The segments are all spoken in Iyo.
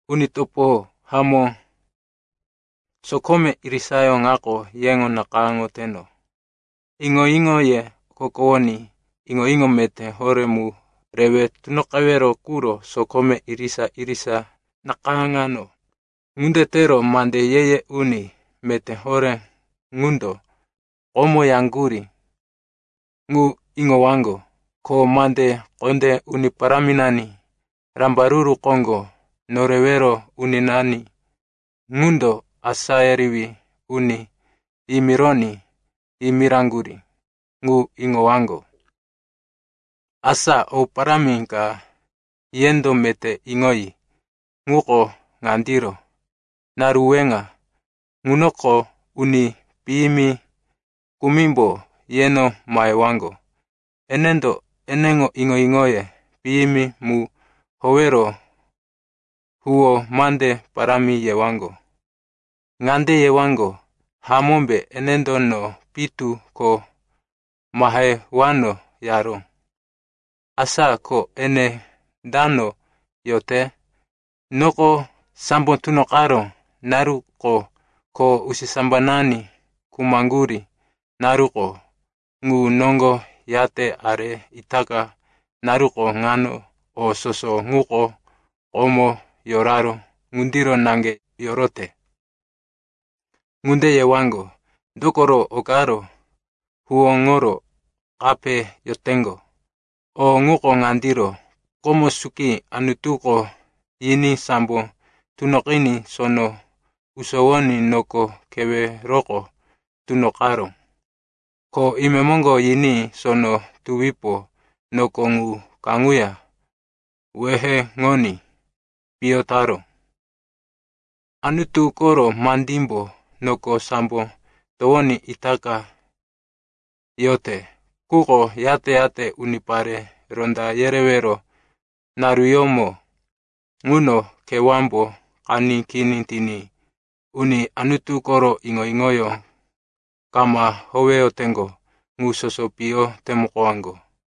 Uni topo hamó, sokome irisayó ŋako yeŋo nakayáŋoteno. Iŋo-iŋoye okokowoní iŋo-iŋo meté horé mu rewe tunoqewero quro sokome irisa-irisa nakayáŋano. Ŋunde tero mande ye-ye uni meté horé ŋundo komo yaŋgurí ŋu iŋowaŋgo, ko mande kondé Uni Paráminani, Rambaruru Koŋgo Norewero Uninani ŋundo asá yerewí uni yimironí yimiraŋgurí ŋu iŋowaŋgo. Asa o parámi ka yendo meté iŋoyi, ŋuko ŋandiro. Naru weŋa ŋunoko uni piyimi kumimbo yeno mahewaŋgo. Enendo eneŋo iŋo-iŋoye piyimi mu howero huwó mande parámi yewaŋgo. Ŋande yewaŋgo, “Hamómbe, enendo, no pitu ko mahewano, yaró? Asa ko ene dano yote? Noko sambo tunoqaró naruko ko usisambanani khumaŋgurí naruko ŋu noŋgo yate are itaka naruko ŋano, o soso ŋuko komo yoraró ŋundiro naŋge yorote.” Ŋunde yewaŋgo, dokoro o karo huwóŋoro kape yoteŋgo. O ŋuko ŋandiro: komo suki Anutuko yiní sambo tunoqiní sono usowoní noko keweroko tunoqaró. Ko imemoŋgo yiní sono tuwipo noko ŋu kaŋuya weheŋoní piyo taró. Anutu koro mandímbo noko sambo towoní itaka yote, quko yate-yate unipare ronda yerewero naruyómo ŋuno kewámbo qaní kini tiní uni Anutu koro iŋo-iŋoyó kama howeyoteŋgo ŋu soso piyo temukowaŋgo.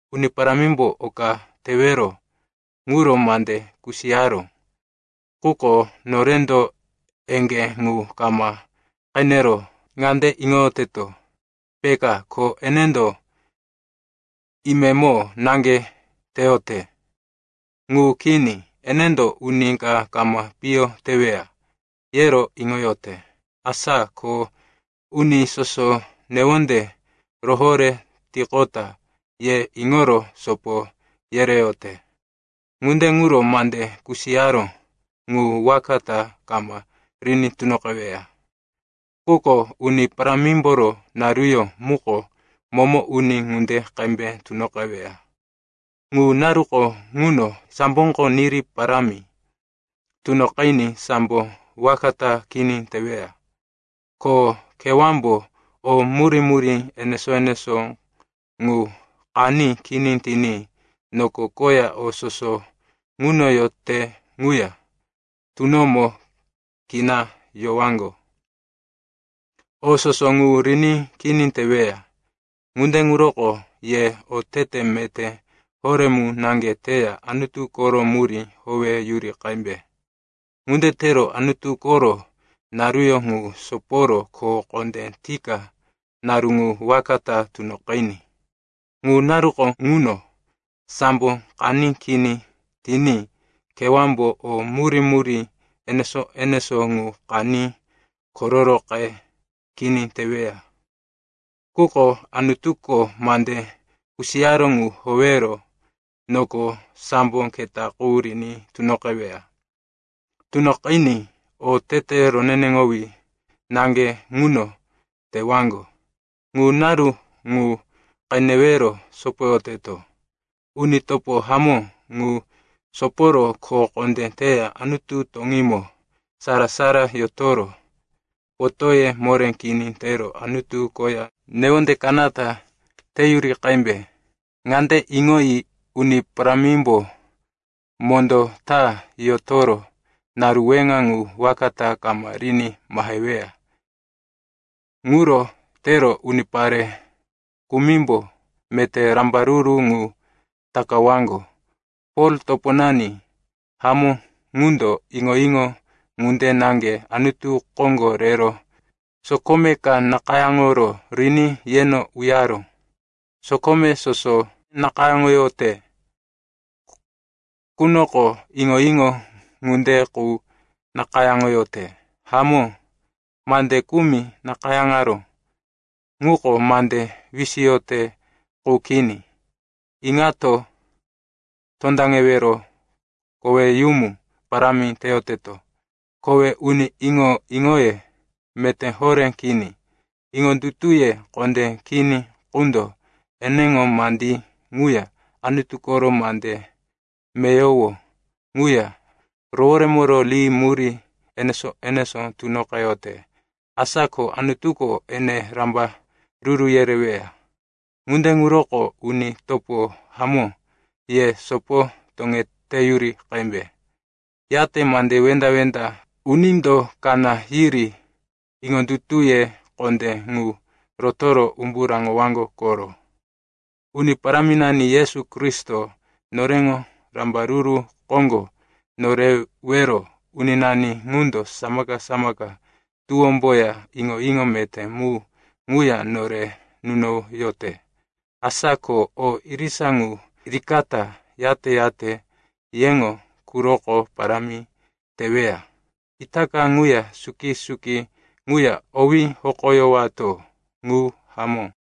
Uni Parámimbo oka tewero ŋuro mande kusiyaró, quko norendo eŋgé ŋu kama qenero ŋande iŋoyoteto, peka, ko enendo imemo naŋge teyote. Ŋu kini. Enendo uni ka kama piyo teweya, yero iŋoyote. Asa ko uni soso newonde rohoré tiqota ye iŋoro sopo yereyote. Ŋunde ŋuro mande kusiyaró ŋu waka ta kama riní tunoqeweya. Quko Uni Parámimboro naruyó muko momo uni ŋunde qembe tunoqeweya. Ŋu naruko ŋuno samboko niri parámi tunoqiní sambo waka ta kini teweya. Ko kewámbo o murí-murí enesó-enesó ŋu qaní kini tiní noko koya o soso ŋuno yote ŋuya tunomo kina yowaŋgo. O soso ŋu riní kini teweya. Ŋunde ŋuroko ye otete meté horé mu naŋge teya Anutu koro murí howeyuri qembe. Ŋunde tero Anutu koro naruyó ŋu soporo kho kondé tika naru ŋu waka ta tunoqiní. Ŋu naruko ŋuno sambo qaní kini tiní kewámbo o murí-murí enesó-enesó ŋu qaní kororoqe kini teweya. Quko Anutuko mande kusiyaró ŋu howero noko sambo keta qu riní tunoqeweya. Tunoqiní otete roneneŋowí naŋge ŋuno tewaŋgo. Ŋu naru ŋu qenewero sopoyoteto. Uni topo hamó, ŋu soporo kho kondé teya Anutu toŋímo sara-sara yotoro potóye moré kini tero Anutu koya newonde kanata teyuri qembe. Ŋande iŋoyi, Uni Parámimbo mondó ta yotoro naru weŋa ŋu waka ta kama riní maheweya. Ŋuro tero unipare kumimbo meté rambaruru ŋu takawaŋgo. Pol, toponani hamó ŋundo iŋo-iŋo ŋunde naŋge Anutu koŋgo rero sokome ka nakayáŋoro riní yeno uyaró. Sokome soso nakayáŋoyote qunoko iŋo-iŋo ŋunde qu nakayáŋoyote. Hamó, mande kumi nakayáŋaró ŋuko mande wisiyote qu kini, iŋato tondaŋewero koweyumu parámi teyoteto. Kowe uni iŋo-iŋoye meté horé kini, iŋondutuye kondé kini qundo eneŋo mandí ŋuya Anutu koro mande meyowo ŋuya roworemoro ri murí enesó-enesó tunoqeyote. Asa ko Anutuko ene rambaruru yereweya. Ŋunde ŋuroko, uni topo hamó, ye sopo toŋeteyuri qembe. Yate mande wenda-wenda unindo kaná yiri iŋondutuye kondé ŋu rotoro umbu raŋowaŋgo koro. Uni Paráminani Yesu Kristo, noreŋo Rambaruru Koŋgo Norewero Uninani ŋundo samaka-samaka tuwómboya iŋo-iŋo meté mu ŋuya nore nunoyote. Asa ko o irisa ŋu rikata, yate-yate yeŋo quroko parámi teweya. Itaka ŋuya suki-suki ŋuya owí hokoyowato. Ŋu hamó.